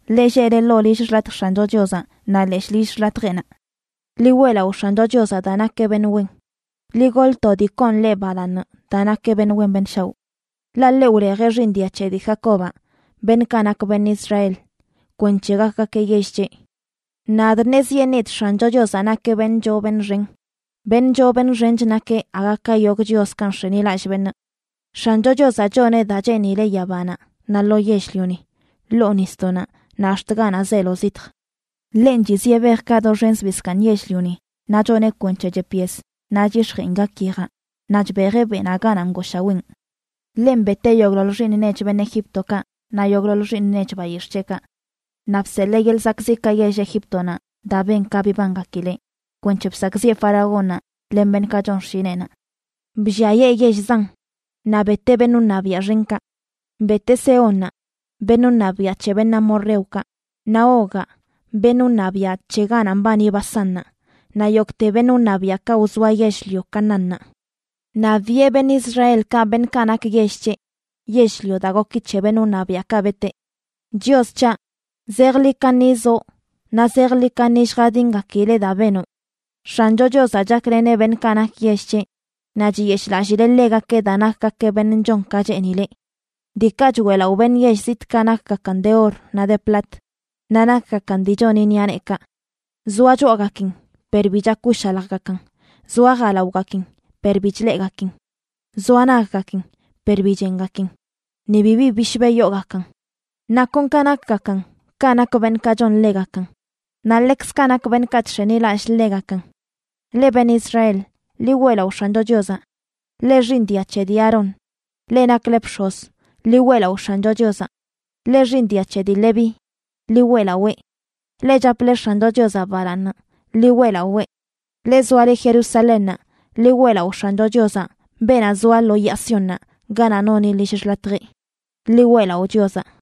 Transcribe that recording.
leꞌ lleꞌle ḻoo lill xḻatj X̱ancho Chiozaꞌ naꞌ leshꞌ lill xḻatjeꞌnaꞌ. Ḻi weꞌlaꞌo X̱ancho Chiozaꞌ daa nakeꞌ beṉꞌ wen; ḻi goḻ to dii koon ḻeꞌ balaaṉ, daa nakeꞌ beṉꞌ wen beṉꞌ shaoꞌ. Ḻaꞌ ḻeꞌ wlejeꞌ xiiṉ dia c̱he dii Jacobaꞌ, beṉꞌkaꞌ nak beṉꞌ Israel, kwenc̱he gakgakeꞌ yell c̱heꞌ. Nadꞌ ṉezyeṉidꞌ X̱ancho Chiozaꞌ nakeꞌ beṉꞌ choo beṉꞌ xen; beṉꞌ choo beṉꞌ xench nakeꞌ aga ka yogꞌ chioskaꞌ nx̱enilallꞌ beṉꞌ. X̱ancho Chiozaꞌ choneꞌ daa cheenileꞌ yabanaꞌ naꞌ lo yell-lioni, ḻoo nisdoꞌnaꞌ naꞌ ax̱t ganaꞌ zeelo zitj. Ḻenꞌ chizieꞌ bejkaꞌ doxen zbii zkaaṉ yell-lioni, naꞌ choneꞌ kwenc̱he chep yes naꞌ chyix̱jeen gak yejaꞌ, naꞌ chbejeꞌ beꞌnaꞌ ganaꞌ ngooshaween. Ḻenꞌ beteꞌ yogꞌḻoḻ xiiṉ nech beṉꞌ Egíptokaꞌ naꞌ yogꞌḻoḻ xiiṉ nech bayix̱ꞌ c̱heꞌkaꞌ. Naꞌ bseḻee yeḻꞌ zakꞌziꞌkaꞌ yell Egíptonaꞌ daa ben ka bibangakileꞌ, kwenc̱he bsakꞌziꞌe faraónnaꞌ len beṉꞌkaꞌ chon xshineꞌnaꞌ. Blliayee yell zan, naꞌ beteꞌ beṉꞌ wṉabiaꞌ xenkaꞌ. Beteꞌ Sehónnaꞌ, beṉꞌ wṉabiaꞌ c̱he beṉꞌ amorreokaꞌ, naꞌ Ogaꞌ, beṉꞌ wṉabiaꞌ c̱he ganaꞌ mbani Basánnaꞌ, naꞌ yogꞌte beṉꞌ wṉabiaꞌkaꞌ wzoa yell-lio Canaánnaꞌ. Naꞌ biꞌe beṉꞌ Israelkaꞌ, beṉꞌkaꞌ nak yell c̱heꞌ, yell-lio daa goki c̱he beṉꞌ wṉabiaꞌkaꞌ beteꞌ. Chios c̱haꞌ, zejḻi kaṉi zoꞌ, naꞌ zejḻi kaṉi lljadingakileꞌ daa benoꞌ. X̱ancho Chiozaꞌ chakleneꞌ beṉꞌkaꞌ nak yell c̱heꞌ, naꞌ chiyeshꞌlallileꞌ ḻegakeꞌ daa nakgakeꞌ beṉꞌ chon ka cheenileꞌ. Diikaꞌ choeꞌlaꞌo beṉꞌ yell zitꞌkaꞌ nakgakan de or naꞌ de plat, naꞌ nakgakan dii choni ṉiꞌa neekaꞌ. Zoa choꞌagakin per bi chak wshaljgakan; zoa jalaogakin per bi chleꞌgakin; zoa naggakin per bi chengakin; ni bibi bishbe yoogakan. Naꞌ kon ka nakgakan kaꞌ nak beṉꞌkaꞌ chon ḻegakan, naꞌ ḻekzkaꞌ nak beṉꞌkaꞌ chx̱enilallꞌ ḻegakan. Leꞌ beṉꞌ Israel, ḻi weꞌlaꞌo X̱ancho Chiozaꞌ. Leꞌ xiiṉ dia c̱he dii Aarón, leꞌ nakle bx̱oz, ḻi weꞌlaꞌo X̱ancho Chiozaꞌ. Leꞌ xiiṉ dia c̱he dii Leví, ḻi weꞌlawee. Leꞌ chaple X̱ancho Chiozaꞌ balaaṉ, ḻi weꞌlawee. Leꞌ zoale Jerusalénnaꞌ, ḻi weꞌlaꞌo X̱ancho Chiozaꞌ beenaꞌ zoa lo yaa Siónnaꞌ ganaꞌ noni lill xḻatjeꞌ. Ḻi weꞌlaꞌo Chiozaꞌ.